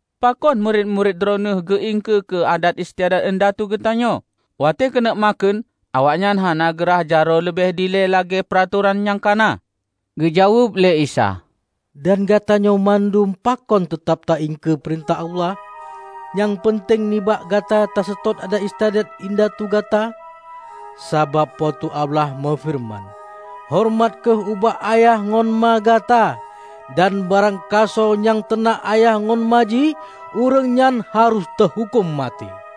"Pakon murit-murit Droeneueh geu-iengkeue keu adat istiadat indatu geutanyoe? Watée keuneuk makheun, awaknyan hana geu rhah jaroe leubeh dilée lagée peuratoran nyang ka na!" Geujaweueb lé Isa, "Dan gata nyoe bandum pakon teutab ta-iengkeue peurintah Allah, nyang peunteng nibak gata taseutôt adat-istiadat indatu gata? Sabab Po teu Allah meufeureuman, 'Horeumat kheueh ubak ayah ngon ma gata,' dan 'Barang gasoe nyang teunak ayah ngon ma jih, ureuëng nyan harôh teuhuköm maté.'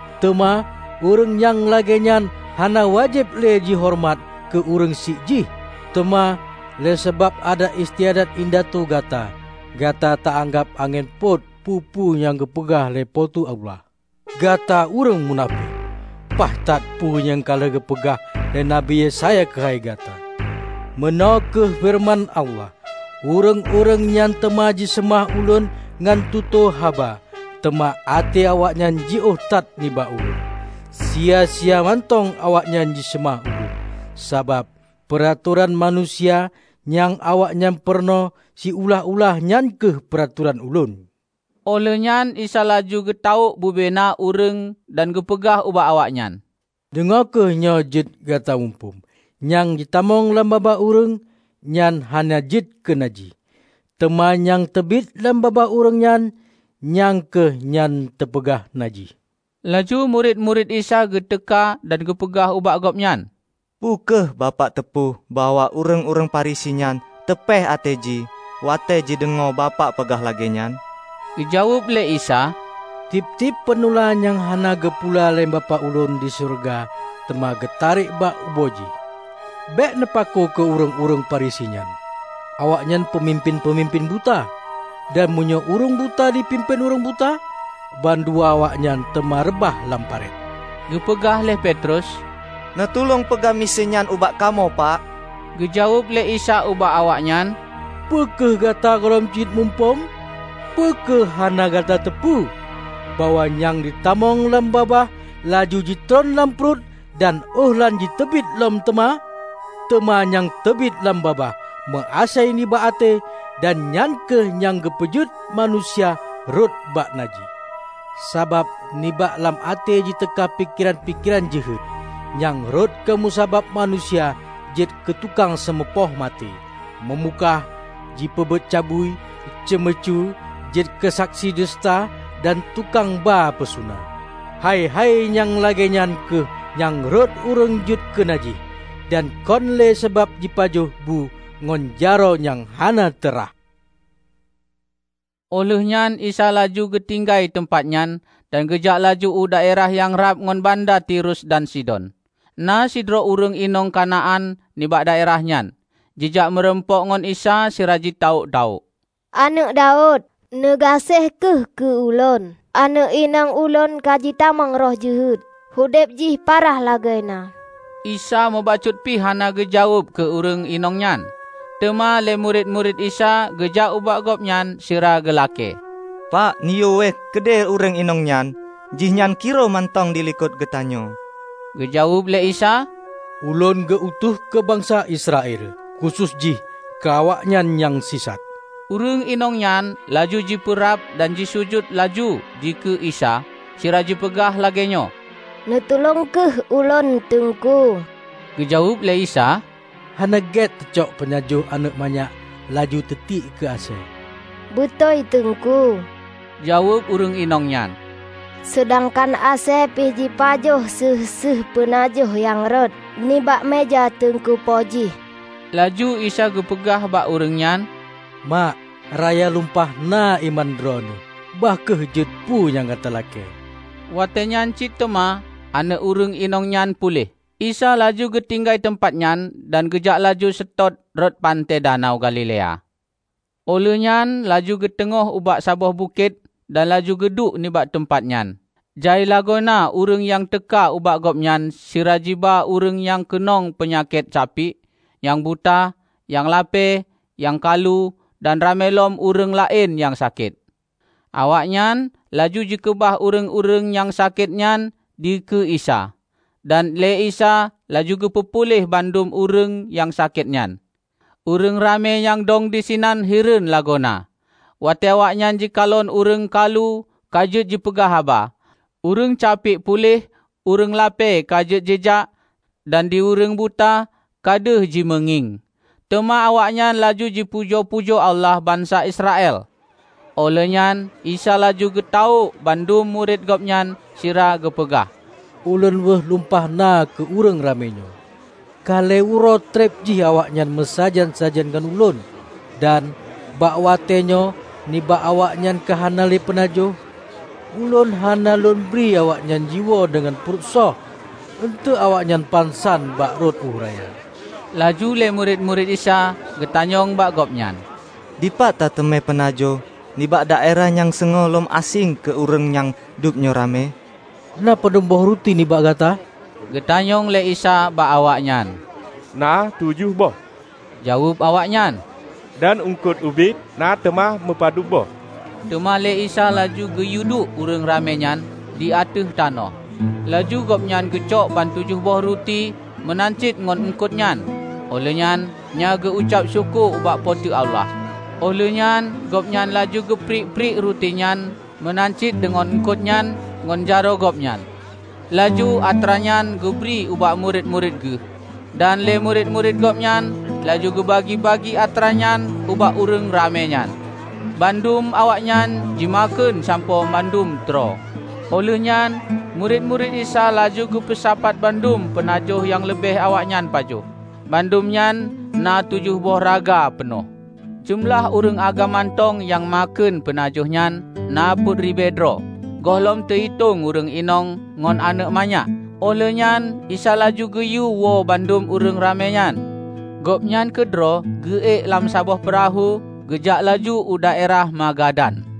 teuma ureuëng nyang lagée nyan hana wajéb lé jihoreumat keu ureuëng syiek jih. Teuma, lé sabab adat istiadat indatu gata, gata ta-anggab angén pôt peue-peue nyang geupeugah lé Po teu Allah. Gata ureuëng munafék! Paih that peue nyang ka lheueh geupeugah lé Nabi Yesaya keuhai gata, 'Meunoe kheueh feureuman Allah: Ureuëng-ureuëng nyan teuma jiseumah Ulôn ngon tutoe haba, teuma até awaknyan jiôh that nibak Ulôn. Sia-sia mantong awaknyan jiseumah Ulôn, sabab peuratoran manusia nyang awaknyan peurunoe siulah-ulah nyan kheueh peuratoran Ulôn.' " Óh lheueh nyan Isa laju geutawök bubena na ureuëng dan geupeugah ubak awaknyan, "Deungoe kheueh nyoe jeuet gata muphom! Nyang jitamong lam babah ureuëng, nyan hana jeuet keu najih; teuma nyang teubiet lam babah ureuëng nyan, nyang kheueh nyang teupeugah najih." Laju murit-murit Isa geuteuka dan geupeugah ubak Gobnyan, "Peu kheueh Bapak teupeu bahwa ureuëng-ureuëng Farisi nyan tupéh até jih watée jideungoe Bapak peugah lagée nyan?" Geujaweueb lé Isa, "Tieb-tieb peunula nyang hana geupula lé Bapak Ulôn di syeuruga teuma geutarek bak ubo jih. Bék neupakoe keu ureuëng-ureuëng Farisi nyan. Awaknyan peumimpén-peumimpén buta; dan meunyoe ureuëng buta jipimpén ureuëng buta, ban dua awaknyan teuma reubah lam paret." Geupeugah lé Petrus, "Neutulông peugah miseue nyan ubak kamoe, Pak!" Geujaweueb lé Isa ubak awaknyan, "Peu kheueh gata gohlom cit muphom? Peu kheueh hana gata teupeu, bahwa nyang jitamong lam babah laju jitron lam pruet, dan óh lheueh nyan jiteubiet lom teuma? Teuma nyang teubiet lam babah, meu-asai nibak até; dan nyan kheueh nyang teupeujeuet manusia rhot bak najih. Sabab nibak lam até jiteuka pikeran-pikeran jeuhet, nyang rhot keu musabab manusia jeuet keu tukang seumupoh maté, meumukah, jipeubuet cabui, ceumeucue, jeuet keusaksi duseuta dan tukang ba peusuna! Hai-hai nyang lagée nyan kheueh nyang rhot ureuëng jeuet keu najih, dan kon lé sabab jipajoh bu ngon jaroe nyang hana teu rhah." Óh lheueh nyan Isa laju geutinggai teumpat nyan dan geujak laju u daerah nyang rab ngon banda Tirus dan Sidon. Na sidroe ureuëng inong Kanaan nibak daerah nyan, jijak murumpok ngon Isa sira jitawök-tawök, "Aneuëk Daud, neugaséh kheueh keu ulôn! Aneuëk inong ulôn ka jitamong roh jeuhet. Udeb jih parah lagoe na." Isa mubacut pih hana geujaweueb keu ureuëng inong nyan. Teuma lé murit-murit Isa geujak ubak Gobnyan sira geulakée, "Pak, neuyue wéeh keudeh ureuëng inong nyan. Jih nyan kiroh mantong dilikot geutanyoe!" Geujaweueb lé Isa, "Ulôn geu-utus keu bansa Israel, khusos jih keu awaknyan nyang sisat." Ureuëng inong nyan laju jipeurab dan jisujut laju dikeue Isa sira jipeugah lagée nyoe, "Neutulông kheueh ulôn, Teungku." Geujaweueb lé Isa, "Hana gét teucok peunajoh aneuëk manyak laju teutiek keu asée." "Beutôi, Teungku," jaweueb ureuëng inong nyan, "Seudangkan asée pih jipajoh séueh-séueh peunajoh nyang rhot nibak meuja teungku po jih." Laju Isa geupeugah bak ureuëng nyan, "Mak, raya lumpah na iman droeneueh! Bah kheueh jeuet peue nyang gata lakée!" Watée nyan cit teuma aneuëk ureuëng inong nyan puléh. Isa laju geutinggai teumpat nyan, dan geujak laju seutôt rot panté Danau Galilea. Óh lheueh nyan laju geuteungoh ubak saboh bukét dan laju geuduek nibak teumpat nyan. Jai lagoe na ureuëng nyang teuka ubak Gobnyan sira jiba ureuëng nyang keunong peunyakét capiek, nyang buta, nyang lapée, nyang kalu, dan ramé lom ureuëng laén nyang sakét. Awaknyan laju jikeubah ureuëng-ureuëng nyang sakét nyan dikeue Isa, dan lé Isa laju geupeu puléh bandum ureuëng nyang sakét nyan. Ureuëng ramé nyang dong disinan hireuen lagoe na, watée awaknyan jikalon ureuëng kalu ka jeuet jipeugah haba, ureuëng capiek puléh, ureuëng lapée ka jeuet jijak, dan di ureuëng buta ka deuh jimeungieng. Teuma awaknyan laju jipujoe-pujoe Allah bansa Israel. Óh lheueh nyan Isa laju geutawök bandum murit Gobnyan sira geupeugah, "Ulôn weueh lumpah na keu ureuëng ramé nyoe. Ka lhée uroe treb jih awaknyan meusajan-sajan ngon Ulôn, dan bak watée nyoe nibak awaknyan ka hana le peunajoh. Ulôn hana Lôn bri awaknyan jiwoe deungon pruet shoh, eunteuk awaknyan pansan bak rot ueh raya." Laju lé murit-murit Isa geutanyong bak Gobnyan, "Dipat ta teumé peunajoh nibak daerah nyang seungue lom aséng keu ureuëng nyang dub nyoe ramé?" "Na padub boh ruti nibak gata?" geutanyong lé Isa bak awaknyan. "Na tujoh boh," jaweueb awaknyan, "dan eungkot ubit na teuma meupadub boh." Teuma lé Isa laju geuyueduek ureuëng ramé nyan di ateueh tanoh. Laju Gobnyan geucok ban tujoh boh ruti meunan cit ngon eungkot nyan, óh lheueh nyan geu-ucab syukoe ubak Po teu Allah. Óh lheueh nyan Gobnyan laju geupriek-priek ruti nyan meunan cit deungon eungkot nyan ngon jaroe Gobnyan, laju atra nyan geubri ubak murit-murit Geuh. Dan lé murit-murit Gobnyan laju geubagi-bagi atra nyan ubak ureuëng ramé nyan. Bandum awaknyan jimakheun sampoe mandum troe. Óh lheueh nyan murit-murit Isa laju geupeusapat bandum peunajoh nyang leubeh awaknyan pajoh. Bandum nyan na tujoh boh raga peunoh. Jeumeulah ureuëng agam mantong nyang makheun peunajoh nyan na peuet ribée droe, gohlom teu-itong ureuëng inong ngon aneuëk manyak. Óh lheueh nyan Isa laju geuyue woe bandum ureuëng ramé nyan. Gobnyan keudroe geu-ék lam saboh peurahô geujak laju u daerah Magadan.